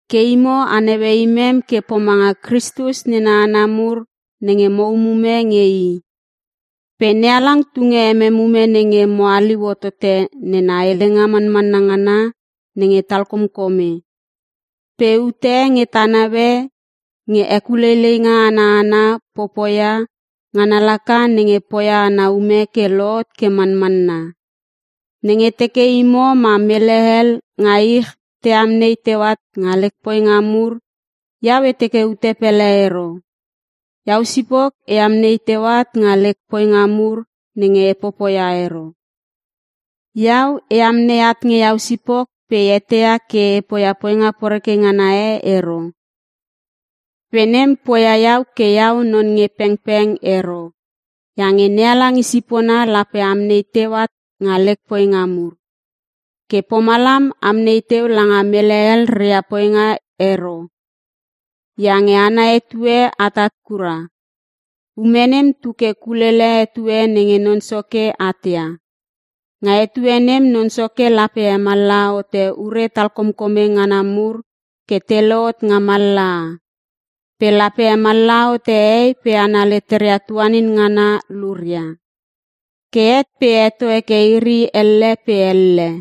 Ke imo a naue imem ke pomanga Kristus nena hana mur nenge mo umume nge I. Pe NeHalang tunge emem ume nenge mo haliu hotote nena helenga manmanna ngana nenge talkomkome. Pe ute e nge ta naue nge hekuleileinga ana non popoia, ngana laka nenge poia ana ume ke lohot ke manmanna. Nenge teke imo ma mele hel nga ich te amnei teu at nga lek poinga mur, iau e teke ute pele ero. Iau sipok e amnei teu at nga lek poinga mur nenge e popoia ero. Iau e amnei at nge iau sipok pe e eteia ke e poia poinga poreke ngana e ero. Pe nem poia iau ke iau non nge pengpeng ero, iange NeHalang i sipona lape amnei teu at nga lek poinga mur. Ke pomalam a amnei teu langa mele hel reria poinga ero iange ana etue atat kura. Ume nem tu ke kulele etue nenge Non Soke atia. Nga etue nem Non Soke lape hemallaha hote ure talkomkome ngana mur ke te lohot nga mallaha. Pe lape hemallaha hote hehei pe hana leteria tuanin ngana luria. Ke het pe heto heke iri elle pe elle.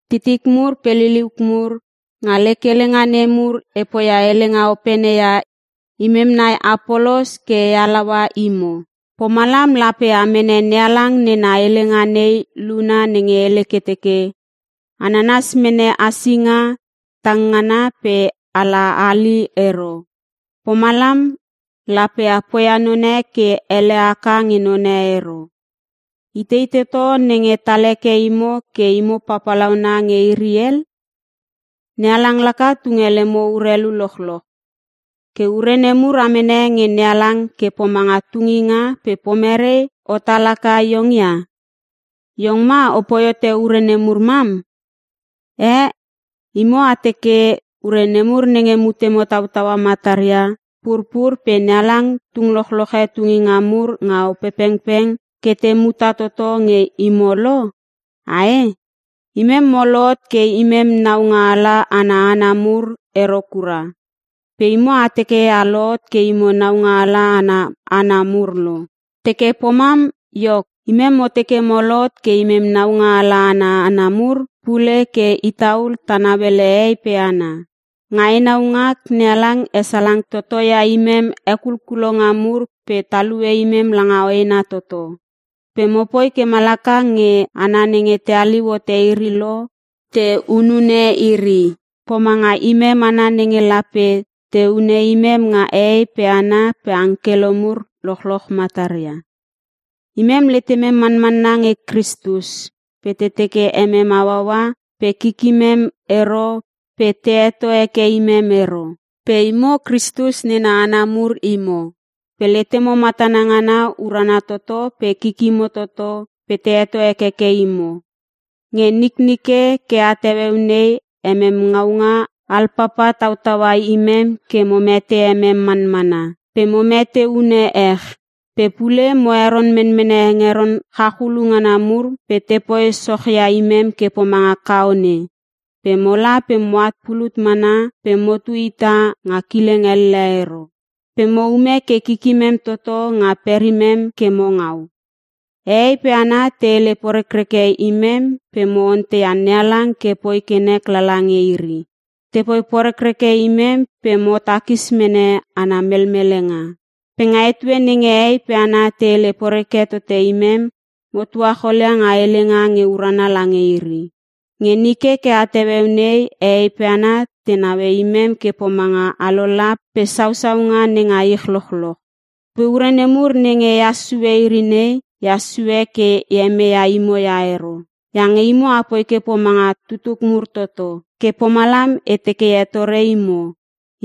Titik mur pe liliuk nga lek helenga nemur e poia helenga opene ia imem nai Apolos ke e halaua imo. Pomalam lape a mene NeHalang nena helenga nei luna nenge hele ke teke, “A nanas mene hasinga tang ngana pe ala hali ero.” Pomalam, lape a poia none ke ele aka nge none ero. Itei toto nenge tal heke imo ke imo papalauna nge iri hel? NeHalang laka tunge lemo urelu lochloch. Ke ure nemur a mene nge NeHalang ke pomanga tunginga pe pomerei otal haka iong ia? Iong ma opoi hote ure nemur mam? Eh, imo a teke ure nemur nenge mutemo tautaua mataria purpur pe NeHalang tung lochloche tunginga mur nga Opepengpeng ke te muta toto nge imo lo, ae? Imem mo lohot ke imem naungaala ana hana mur ero kura pe imo a teke a lohot ke imo naungaala ana hana mur lo. Teke pomam iok, imem mo teke mo lohot ke imem naungaala ana hana mur pule ke ita ul ta nauele hehei pe hana. Nga enau ngak, NeHalang hesalang toto ia imem hekulkulonga mur pe talue imem langa hoena toto. Pe mopoi ke malaka nge hana nenge te haliu hote iri lo ke te teke te hunune iri. Pe nakuna pomanga imem hana nenge lape te hune imem nga hehei pe hana pe angkelo mur lochloch mataria. Imem letemem manmanna nge Kristus pe te teke emem hauaua pe kikimem ero pe te heto heke imem ero. Pe imo Kristus nena hana mur imo pe letemo matana ngana urana toto pe kikimo toto pe te heto hekeke imo. Nge niknike ke at heueu nei emem ngaunga alpapa tautaua imem ke mo mete emem manmana, pe mo mete unune ech. Pe pule mo heron menmene hengeron chachulu ngana mur pe tepoi sochia imem ke pomanga kaone pe mola pe moat pulut mana pe motu hita nga kileng elle ero. Pe mo ume ke kikimem toto nga perimem ke mo ngau. Hehei pe hana te hele porekreke imem pe mo onteia NeHalang ke poi ke nek lala nge iri. Tepoi porekreke imem pe mo takis mene ana melmelenga. Pe nga etue nenge hehei pe hana te hele poreke tote imem, mo tuacholia nga helenga nge urana lange iri. Nge nike ke at heueu nei hehei pe hana te naue imem ke pomanga alolap pe sausaunga nenga ich lochloch. Pe ure nemur nenge ehas sue iri nei, ehas sue ke e hemeia imo ia ero. Iange imo apoi ke pomanga tutuk mur toto, ke pomalam e teke e hetore imo.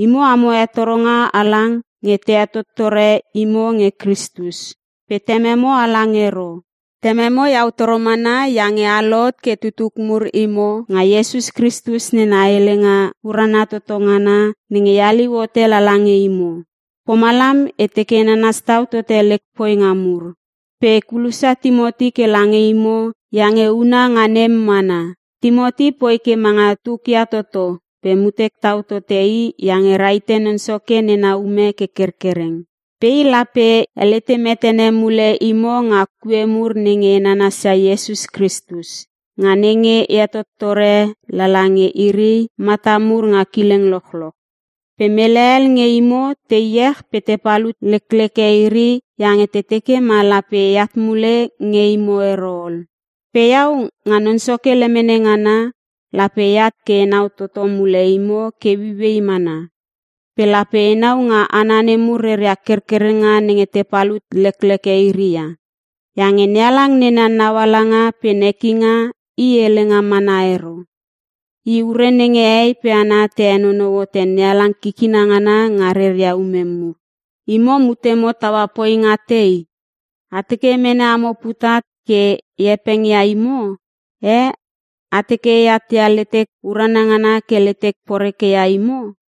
Imo amo hetoronga halang nge te hetottore imo nge Kristus, pe tememo halang ero. Tememo iau toro mana iange a lohot ke tutuk mur imo nga Iesus Kristus nena Helenga Urana Toto Ngana nenge e haliu hote lala nge imo. Pomalam e teke a nanas tau tote lek poinga mur. Pe e kulosia Timoti ke lange imo iange huna nga nem mana. Timoti poi ke manga tukia toto pe mutek tau tote i iange rahite Non Soke nena ume ke kerkereng. Pe i lape helete metene mule imo nga kue mur nenge e nanasia Iesus Kristus, nga nenge e hetottore lala nge iri mata mur nga kileng lochloch. Pe mele hel nge imo te iech pe te palut lekleke iri iange te teke ma lape eat mule nge imo ero ol. Pe iau, nga Non Soke lemene ngana, lape eat ke enau toto mule imo ke ueiuei mana. Pe lape enau nga hana nemur reria kerkerenga nenge te palut lekleke iri ia. Iange NeHalang nena naualanga pe nekinga i helenga mana ero, i ure nenge hehei pe hana te henonou hote NeHalang kikina ngana nga reria ume mur. Imo mutemo taua poinga tei? A teke e mene amo put at ke e hepengia imo? Eh, a teke e atia letek urana ngana ke letek porekeia imo?